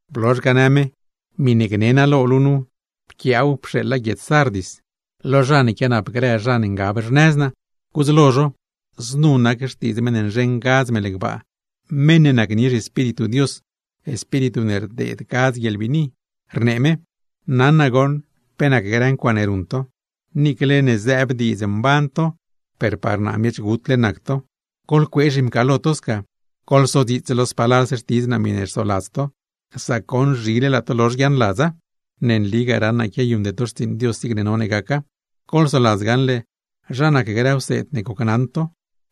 Blozh ga, në me: ―Miṉe gni naa lo luu nu, pquiaaw pxeeḻa guiedz Sardis, lo zha ne quianap grë zha ne ngab xnëz naa, gudz lo zho: “Znu nac xtiidz meṉ ne nzheṉ gadz mel gbaa, meṉ ne nacnie zhiEspíritu Dios, Espíritu ne rdeed gadz guieḻbiini, rnee me: ’Naṉ naa goṉ pe nac grë ncuaaṉe ruṉ to, niicle zëëb diidz mban to, per par naa miech gutle nac to. ¡Goḻcuee zhimcaalo to sca! Goḻsodziits lo spalalse xtiidz naa miṉe rsoladz to, sac goṉ zhile laa to lozh guiaaṉladza. Ne nligaa, raṉ naa quiayuṉde to xtsiiṉ Dios zig none gaca. Goḻsoladz gaṉle zha nac grë wseed ne gocnaṉ to,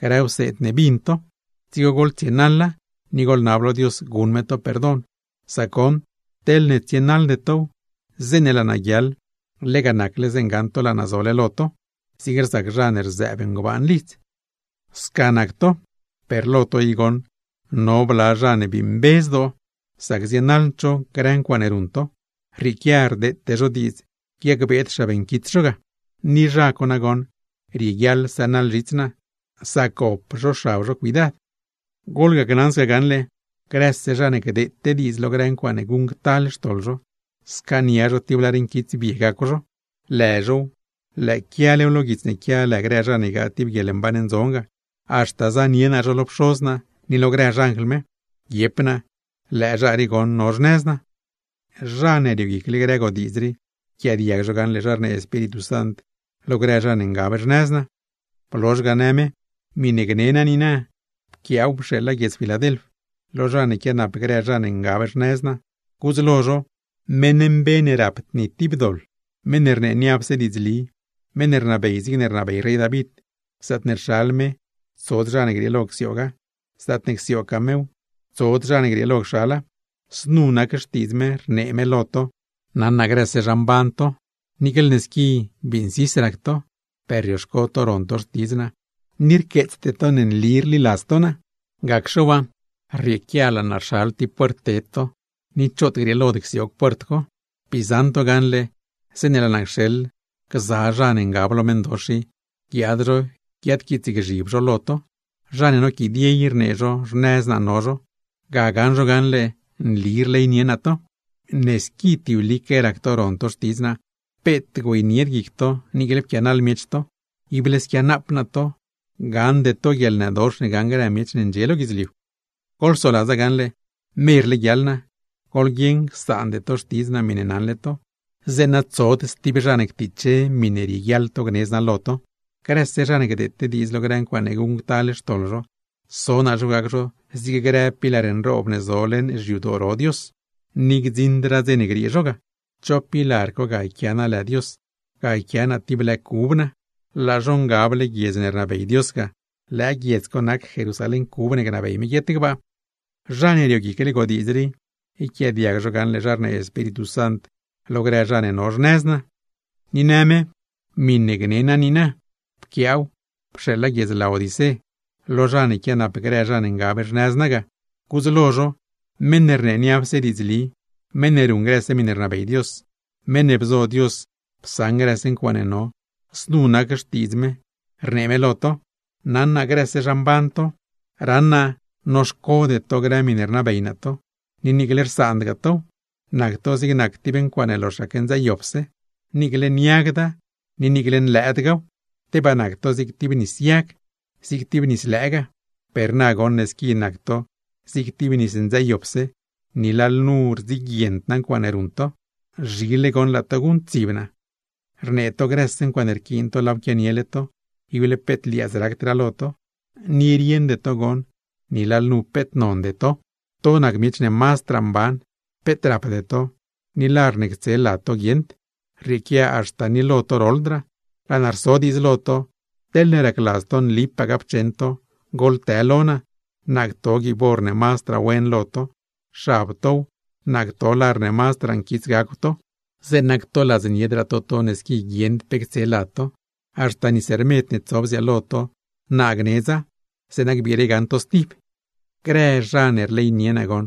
grë wseed ne bin to; dzigo goḻtsienaḻa, ni goḻnab lo Dios guṉ me to perdon. Sac goṉ, teḻne tsienaḻde tow, zeeṉe laa naa guiaḻ, lega nacle zeeṉe gaṉ to laa naa zole lo to; zig rzac zha ne rzëëb ngbaan lidz. ’Sca nac to, per lo to i goṉ no bla zha ne bii mbe zdoo, sac zienaḻd zho grë ncuaaṉe ruṉ to; rrieequia rdeete zho diidz guiacbeed xab nquits zho ga. Ni zha co nagoṉ rieguiaḻ sënaḻ zhits naa, sac gop zho xab zho cuidad. ’Goḻgona gaṉle, grëse zha ne gdeete diidz lo grë ncuaaṉe guṉctal xtoḻ zho, scaania zho tib lar nquitsbie gacw zho; lë zhow, lëë quialew lo guits ne quia lë grë zha ne ygaa tib guieḻmban ndzon ga; haxta zanie naa zho lo Pxoz naa ni lo grë xanjl me, guiep naa: Lëë zha rii goṉ no xnëz naa. ’Zha ne rioguicle grë godiidz rii, yquiaadiag zho gaṉle zha rnee Espíritu Sant lo grë zha ne ngab xnëz naa.” Blozh ga në me: ―Miṉe gni naa niina, pquiaaw pxeeḻa guiedz Filadelf, lo zha ne quianap grë zha ne ngab xnëz naa, gudz lo zho: “Meṉ mbe ne rapd ni tib doḻ, meṉ ne rnee niapse diidzli, meṉ ne rnabey zigne bnabey rey David; zaatne rxal me, tsod zha ne grieelo csiooga, zaatne csiooggaa mew, tsod zha ne grieelo cxala; znu nac xtiidz me, rnee me lo to: ’Naṉ naa grëse zha mban to; niicle ne squi bii nsis rac to, per rioxco to ron to xtidz naa, ni rqueetsde to ne nli rliladz to naa. Gacxe waa, rrieequia laa naa rxal tib puert ted to, ni choot grieelod csioog puert co. Bii zaṉ to gaṉle, zeeṉe laa naa cxeḻ gza zha ne ngab lo meṉdox i, guiaad zho guiadquiitsgzhib zho lo to, zha ne noquidie i rnee zho xnëz naa no zho. Ga gaṉ zho gaṉle nli rleynie naa to. Ne squi tiblique rac to ron to xtidz naa, peet güeynied guic to niicle pquianaḻ miech to, ible squianaap naa to, gaṉde to guieḻnëdox ne gaṉ grë miech ne ndxie lo guidzliu. ’Goḻsoladza gaṉle, merle guiaḻ naa. Goḻguieṉ csaande to xtidz naa miṉe naṉle to, zeeṉa tsod stib zha ne ctiche miṉe rieguiaḻ to gnedz naa lo to. Grëse zha ne gdeete diidz lo grë ncuaaṉe guṉctal xtoḻ zho, so naa zho gac zho zig grë pilar nroob ne zo leṉ xyadoo ro Dios, ni gdziṉdraa dze ne griee zho ga; cho pilar co, ga yquia naa lë Dios, ga yquia naa tib lë cub naa. Laa zho ngable guiedz ne rnabey Dios ga; lëë guiedz co nac Jerusalén cub ne gnabey me guiet gbaa. ’Zha ne rioguicle godiidz rii, yquiaadiag zho gaṉle zha rnee Espíritu Sant lo grë zha ne no xnëz naa.” Ni në me: ―Miṉe gni naa niina, pquiaaw pxeeḻa guiedz Laodicé, lo zha ne quianap grë zha ne ngab xnëz naa ga, gudz lo zho: “Meṉ ne rnee niapse diidzli, meṉ ne ruṉ grëse miṉe rnabey Dios, meṉ ne bzo Dios psaṉ grëse ncuaaṉe no, znu nac xtiidz me, rnee me lo to: ’Naṉ naa grëse zha mban to. Raṉ naa noxcode to grë miṉe rnabey naa to, ni niicle rsaandgaa tow; nac to zig nac tib ncuaaṉe loxaque ndzëëyopse, niicle niagda ni niicle nlëëdgaaw. ¡Tebaa nac to zig tib nis yag, zig tib nis lëëgaa! Per na goṉ ne squi nac to zig tib nis ndzëëyopse, ni lalnu rdziguiend naa ncuaaṉe ruṉ to. ¡Zhile goṉ laa to guṉctsib naa! ’Rnee to grëse ncuaaṉe rquiin to laaw quianiele to, ible peet liaadz racdraa lo to, ¡ni rieṉde to goṉ ni lalnu peet nonde to! To nac miech ne mazdraa mban, peet rapde to, ni lar ne ctse lad to guieṉd, rrieequia haxta ni lo to roḻdraa. Laa naa rso diidz lo to: Teḻne racladz to nlipaa gapcheṉ to, goḻtë lo naa, naa cto guiib or ne mazdraa wen lo to; xab tow, naa cto lar ne mazdraa nquits gacw to, zeeṉa ctoladzniedraa to to ne squi guieṉd pe ctse lad to; haxta nis rmed ne tso bziaalo to, naa gnedza, zeeṉa gbiire gaṉ to stib. ’Grë zha ne rleynie naa,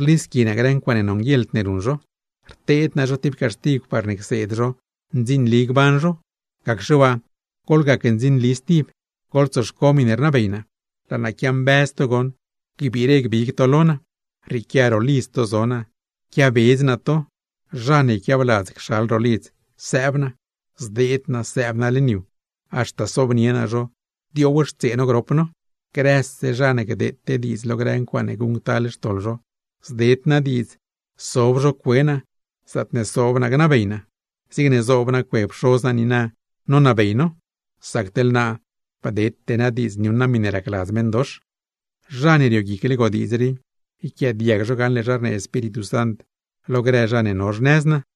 rlisqui naa grë ncuaaṉe nonguieḻd ne ruṉ zho, rteed naa zho tib caxtigw parne cseed zho ndzinli gban zho; gacxe waa goḻgac ndzinli stib, goḻtsoxco miṉe rnabey naa. Laa naa quiambëz to goṉ gbiire gbig to lo naa. Rrieequia ro lidz to zo naa, quiabedz naa to. Zha ne yquiabladz cxal ro lidz sëëb naa, zdeed naa, ni haxta sobnie naa zho diowxtsee no grop no. Grëse zha ne gdeete diidz lo grë ncuaaṉe guṉctal xtoḻ zho, zded naa diidz sob zho cue naa, zaatne sob naa gnabey naa; zigne zoob naa cue Pxoz naa niina nonabey no; sac teḻ naa, bdete naa diidz niuṉ naa miṉe rnabey meṉdox. ’Zha ne rioguicle godiidz rii, yquiaadiag zho gaṉle zha rnee Espíritu Sant lo grë zha ne no xnëz naa.”